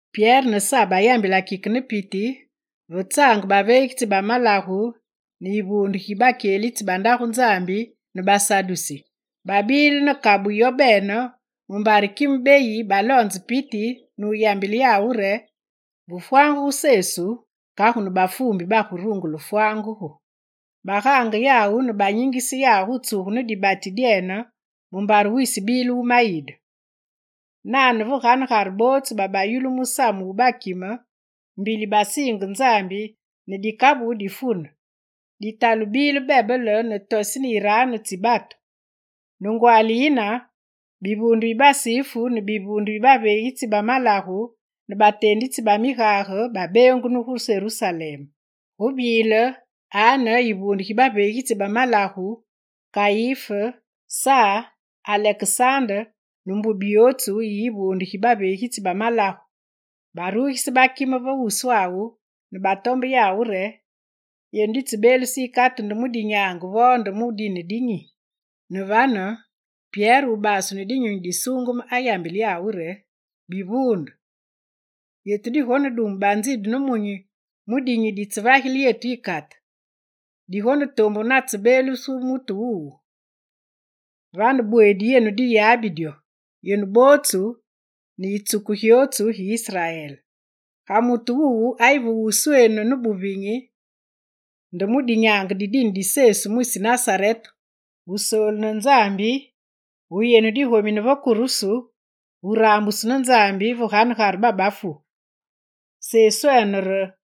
Pyere ne Sa bayambilenge kike ne piti, ve tsaange baveegitsi ba malagu ne yivuunde gi bakyelitsi ba Ndagu Nzambi ne basadusi. Babile ne kabu yobene mumbare kime beyi baloonze piti nuyambile yawu re, ve fwangugu Sesu, kagu ne bafuumbi barungule wufwangugu. Bagaange yawu ne banyingise yawu gu tsugu ne dibati dyene mumbare wisi bile wumayide. Nane, ve ganegare bootsu babayulu musamu wu bakime, mbili basiinge Nzambi ne dikabu difune, ditalu bile bebele ne toseni yiraanu tsi batu. Ne ngwaali yine, bivuunde bi basifu ne bivuunde bi baveegitsi ba malagu ne bateenditsi ba migage babeengunu gu Serusalem. Gu bile Ane, yivuunde gi baveegitsi ba malagu, Kayif, Sa, Alekesande ne mbubi yootsu yi yivuunde gi baveegitsi ba malagu. Barugise bakime ve wuswawu ne batombe yawu re: «Yenu ditsebeeluse yikate nde mu dinyaange vo nde mu dine di nyi?» Ne vane, Pyere wubasu ne Dinyunyi Disuungeme ayambile yawu re: «Bivuunde, yetu digonedumu banzidu nemunyi mu dinyi ditsevagile yetu yikate. Digonetombu natsebeelugu mutu wuwu. Vane, bweedi yenu diyabi dyo, yenu bootsu, ne yitsuku gyootsu gi Israel: Ga mutu wuwu ayi ve wuswenu ne buvinyi, nde mu dinyaange di dine di Sesu mwisi Nasarete Wusoolu ne Nzambi, wugomine yenu va kurusu, wuraambusu ne Nzambi ve ganegare babafu. Seswene re: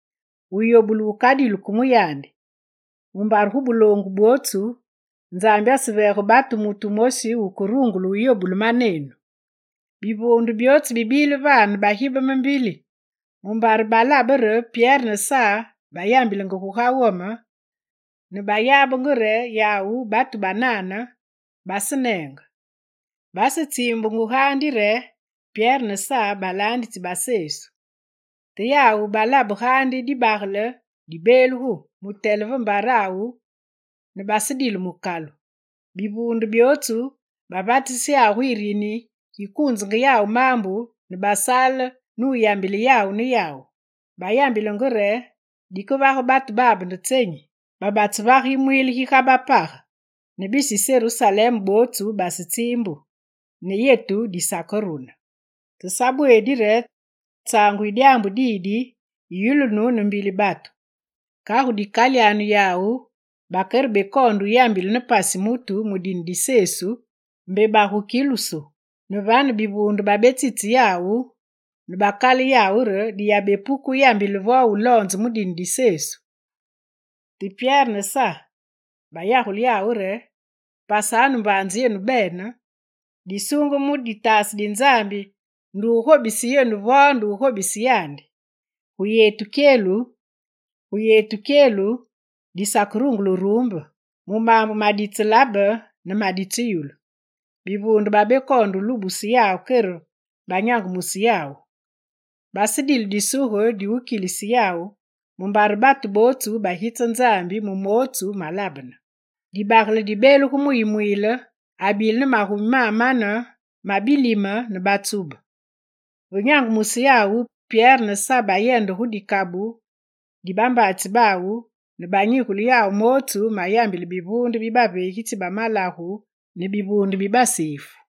Wuyobulu wukadilu ke mu yandi, mumbare gu buloongu bwootsu, Nzambi aseveege batu mutu wumosi wukerungule wuyobule manenu.» Bivuunde byootsu bibile vane bigibeme mbili, mumbare balabenge re Pyere ne Sa bayambilenge guga wome ne bayabenge re yawu batu banane, baseneenge. Basetsiimbungu gaandi re Pyere ne Sa balaanditsi ba Sesu. Te yawu balabe gaandi dibagele dibeeluge, mutele ve mbarawu ne basedile mukalu. Bivuunde byootsu bavatise yawu gu yirini gi gukuunza yawu maambu ne basaale ne wuyambile yawu ne yawu. Bayambilanenge re: «Dikevage batu babe nde tsenyi? Babatsevage yimwiile gi ga bapage, ne bisi Serusalem bootsu basetsiimbu; ne yetu disakerune. Te sabweedi re tsaangu yi dyaambu didi yiyulunu ne mbili batu. Kagu dikali yawu bakere bekoonde wuyambile ne pasi mutu mu dine di Sesu, mbe bagukilusu.» Ne vane, bivuunde babetsitse yawu ne bakale yawu re diyabepuke wuyambile vo wuloonze mu dine di Sesu. Te Pyere ne Sa bayagule yawu re: «Pasanu mbaanze yenu bene, disuungeme mu ditaase di Nzambi nde wugobise yenu vo nde wugobise yandi? Gu yetu kyelu, disakerungule wuruumbe mu maambu maditselabe ne maditseyulu.» Bivuunde bibekoonde wulubuse yawu kere banyangumuse yawu. Basedile disuge diwukilise yawu, mumbare batu bootsu bagitsa Nzambi mu mootsu malabene. Dibagele dibeelugu mu yimwiile abile ne magumi mamane ma bilime ne batsube. Ve nyangumusu yawu, Pyere ne Sa bayende gu dikabu di bambaatsi bawu ne banyigule yawu mootsu mayambile bivuunde bi baveegitsi ba malagu ne bivuunde bi basifu.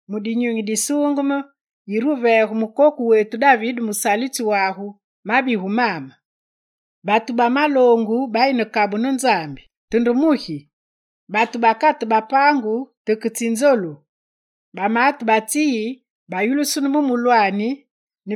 Mu Dinyunyi Disuungeme, yire wuveege mukoku wetu David musalitsi wagu, mabigu maame: “Batu ba maloongu bayi ne kabu ne Nzambi, te nde mugi? Batu bakate bapaangu, te ke tsi nzolu! Bamaate ba tsi yi bayulusunu mu mulwaani,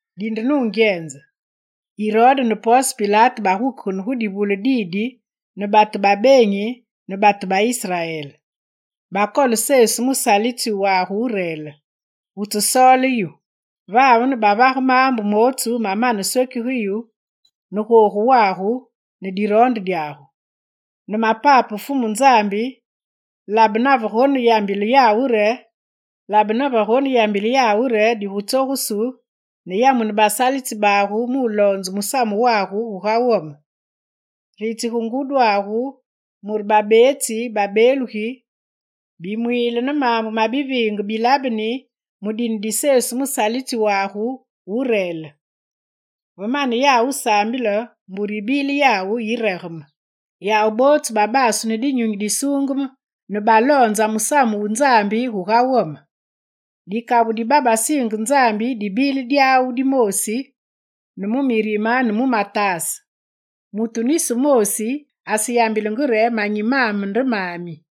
Dinde nungyenze, Irode ne Ponse Pilate bagukegene gu divule didi ne batu ba beenyi ne batu ba Israel. Bakole Sesu musalitsi wagu wu reel, wutsesoole yu. Vane bavage maambu mootsu mamane swekige yu ne googu wagu ne diroonde dyagu. Ne mapape Fumu Nzambi, labe navegoneyambile yawu re digutsogusu, ne yamune basalitsi bagu muloonze musamu wagu guga wome. Ritsige ngudyagu mure babeetsi babeelugi, bimwiile ne maambu ma biviinge bilabeni mu dine di Sesu musalitsi wagu wu reel.» Ve mane yawu wusaambile, mbure yibile yawu yiregeme. Yawu bootsu babasu ne Dinyunyi Disuungeme ne baloonza musamu wu Nzambi guga wome. Dikabu di babasiinge Nzambi dibile dyawu dimoosi ne mu murime ne mu mataase. Mutu nisi wumoosi aseyambilenge re manyi mame nde mami,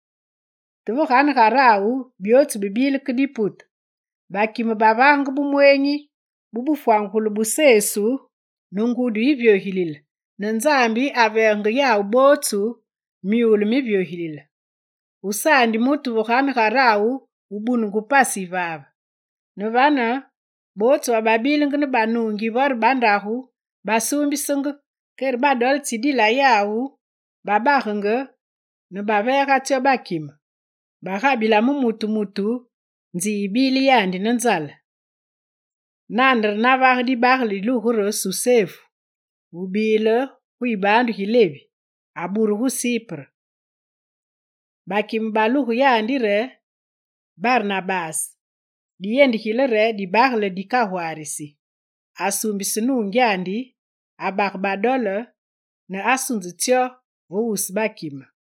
te ve ganegarawu byootsu bibile ke dipute. Bakime bavagenge bumweenyi bu bufwangugulu bu Fumu Sesu ne ngudi yivyogilile, ne Nzambi aveegenge yawu bootsu myule mivyogilile. Gusaandi mutu ve ganegarawu wubunungu pasi yivaave. Ne vane, bootsu bababilenge ne banuungi vore bandagu basuumbisenge, kere badole tsidila yawu babagenge ne baveega tsyo bakime; bagabila mu mutu mutu nzi yibile yandi ne nzale. Nane re navage dibagele dilugu re Susefu, wubile gu yibaandu gi Levi, aburu gu Sipre. Bakime baluge yandi re Barnabase, diyendigile re dibagele dikagwaarisi. Asuumbise nuungyandi, abage badole nusunze tsyo ve wusu bakime.